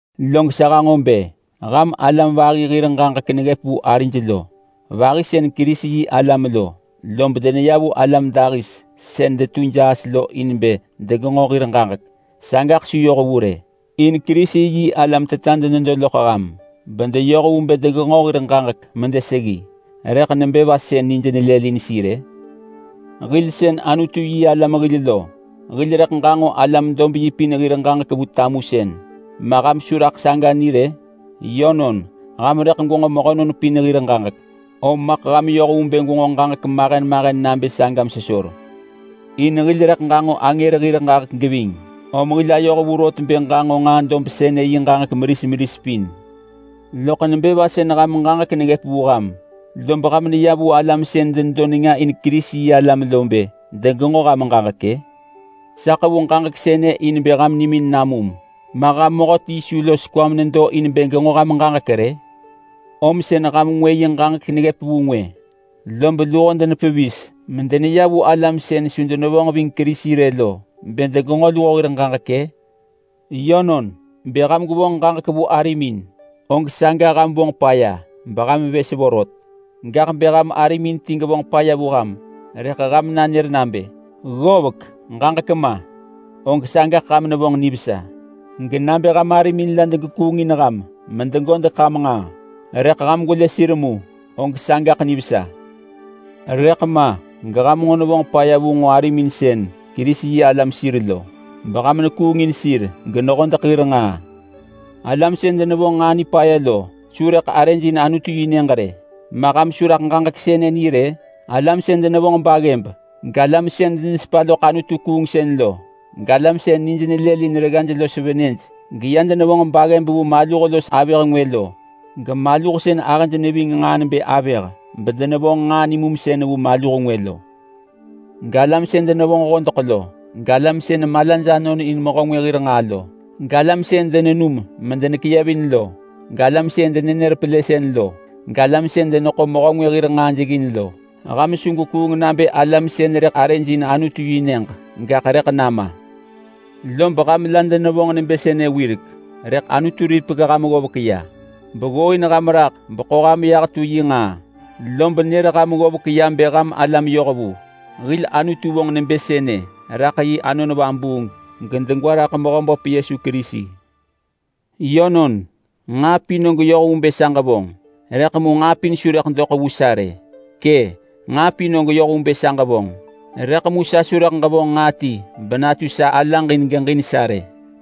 Log sa hanġo bë ham alam vahi hir ġaġek neggëp vu arij lo vahi sën Kerisi-yi-alam lo, lob deneya vu alam dahis sën detu jaas lo in bë degenġo hir ġaġek. Sagaḳ su yoh vu rë. In Kerisi-yi-alam teta denedo vu ham bedeyoh vu bë degenġo ġaġek medeseggi, om nebë va sën nij nelëlin sir-ë? Hil sën Anutu-yi-alam hil lo hil rëḳ ġanġo alam-dob-yi pin hir ġaġek vu tamusën, ma ham su raḳ saga ni rë? Yönon, ham rëḳ gwenġo mehönon pin hir ġaġek, om maḳ ham yoh vu bë gwenġo ġaġek mahen mahen nabë saga megwero! In hil rëḳ ġanġo angër hir ġaġek geving, om hil ayoh vu rot bë ġanġo nġaa dob sënë yi ġaġek meris meris pin. Loḳ nebë va sën ham ġaġek neggëp vu ham rëḳ ham neya vu alam sën denedo nenga in Kerisi-yi-alam lo in bë degenġo ham ġaġek-ë? Sa ḳevu ġaġek sënë in bë ham nimin namum! Ma ham mehöti su los kwa menedo in bë genġo ham ġaġek rë? Om sën ham ti nenër ngwë, lob luho denepevis medeneya vu alam sën su denesepa loḳ Kerisi rë lo in bë degenġo luho hir ġaġek-ë? Yönon, bë ham gwevonġ ġaġek vu arimin, og saga ham vonġ paya beham vës vorot. Gaḳ bë ham arimin ti gevonġ paya vu ham rëḳ ham nanër nabë, “Ggovek, ġaġek ma!”, og sagaḳ ham nevonġ nivesa. Genabë ham arimin la degekuungin ham medegodeḳ ham nġaa, rëḳ ham gwelë sir mu, og sagaḳ nivesa. Rëḳ ma geham nġo nevonġ paya vu nġo arimin sën Kerisi-yi-alam sir lo beham nekuungin sir genehodeḳ hir nġaa! Alam sën denevonġ nġaa nipaya lo su rëḳ arëj in Anutu-yi-nyëġ rë. Ma ham su raḳ ġaġek sënë ni rë? Alam sën denevonġ baggëb, galam sën denesepa loḳ anutu-kuungsën lo, galam sën nij nelëlin reggaj los venëj geya denevonġ baggëb vu maluh los avëh ngwë lo, gemaluh sën ahëj neving nġaa nebë avëh bedenevonġ nġaa nimumsën vu maluh ngwë lo, galam sën denevonġ hodeḳ lo, galam sën malaj anonin mehö ngwë hir nġaa lo, galam sën denenum medenekeyevin lo, galam sën denenër pelësën lo, galam sën deneḳo mehö ngwë hir nġaa jeggin lo. Ham su gwekuung nabë alam sën rëḳ arëj in Anutu-yi-nyëġ, gaḳ rëḳ nama! Lob ham la denevonġ nebë sënë wirek, rëḳ Anutu ripek ham ggovek ya beggooin ham raḳ beḳo ham yah tu yi nġaa, lob nër ham ggovek ya nebë ham alam yohvu. Hil Anutu vonġ nebë sënë raḳ yi Anon Vabuung gedegwa raḳ Mehöböp Yesu Kerisi. Yönon, nġaa pin og yoh vu bë sa ġevonġ! Rëḳ mu nġaa pin su rëḳ doḳ vu sa rë. Kë’, nġaa pin og yoh vu bë sa ġevonġ! Rëḳ mu sa su rëḳ ġevonġ nġaa ti benatu sa alaġ in geġin sa rë.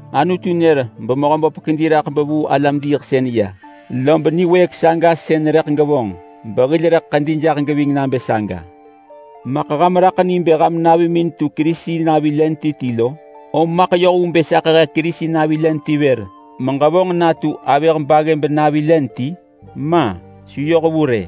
Anutu nër beMehöböp kedi raḳ bevuu alam-diiḳsën ya, lob niwëëk saga sën rëḳ gevonġ behil rëḳ ḳedi jaḳ geving nabë saga. Maḳ ham raḳ ni bë ham navimin tu Kerisi navi len ti ti lo? Om maḳ yoh vu bë sa ḳehe Kerisi navi len ti vër meġevonġ natu avëh baggëb navi len ti? Ma! Su yoh vu rë!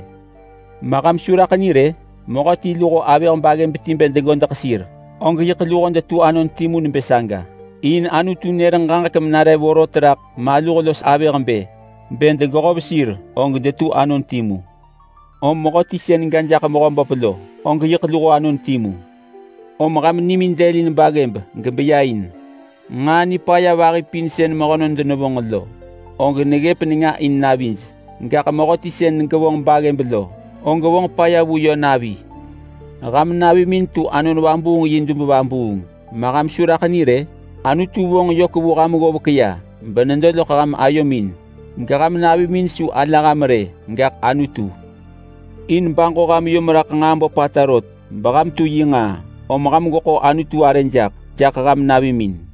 Ma ham su raḳ ni rë? Mehöti luho avëh baggëb ti bë degodeḳ sir og yiḳ luho detu anon timu nebë saga, in Anutu nër ġaġek menare vorot raḳ maluh los avëh bë, “Bë degehov sir og detu anon timu!” Rëḳ mehöti sën ga jaḳ Mehöböp lo og yiḳ luho anon timu. Om ham nimin dëlin baggëb gebeya in. Nġaa nipaya vahi pin sën mehönon denevonġ lo, og neggëp nenga in navij, gaḳ mehöti sën gevonġ baggëb lo, og vonġ paya vu yö navi. Ham navimin tu Anon Vabuung yi dub vabuung, ma ham su raḳ ni rë? Anutu vonġ yök vu ham ggovek ya benedo loḳ ham ayomin, geham navimin su ala ham rë gaḳ Anutu. In baġo ham yom raḳ nġaa böpata rot beham tu yi nġaa, om ham gweḳo Anutu arë jaḳ, jaḳ ham navimin.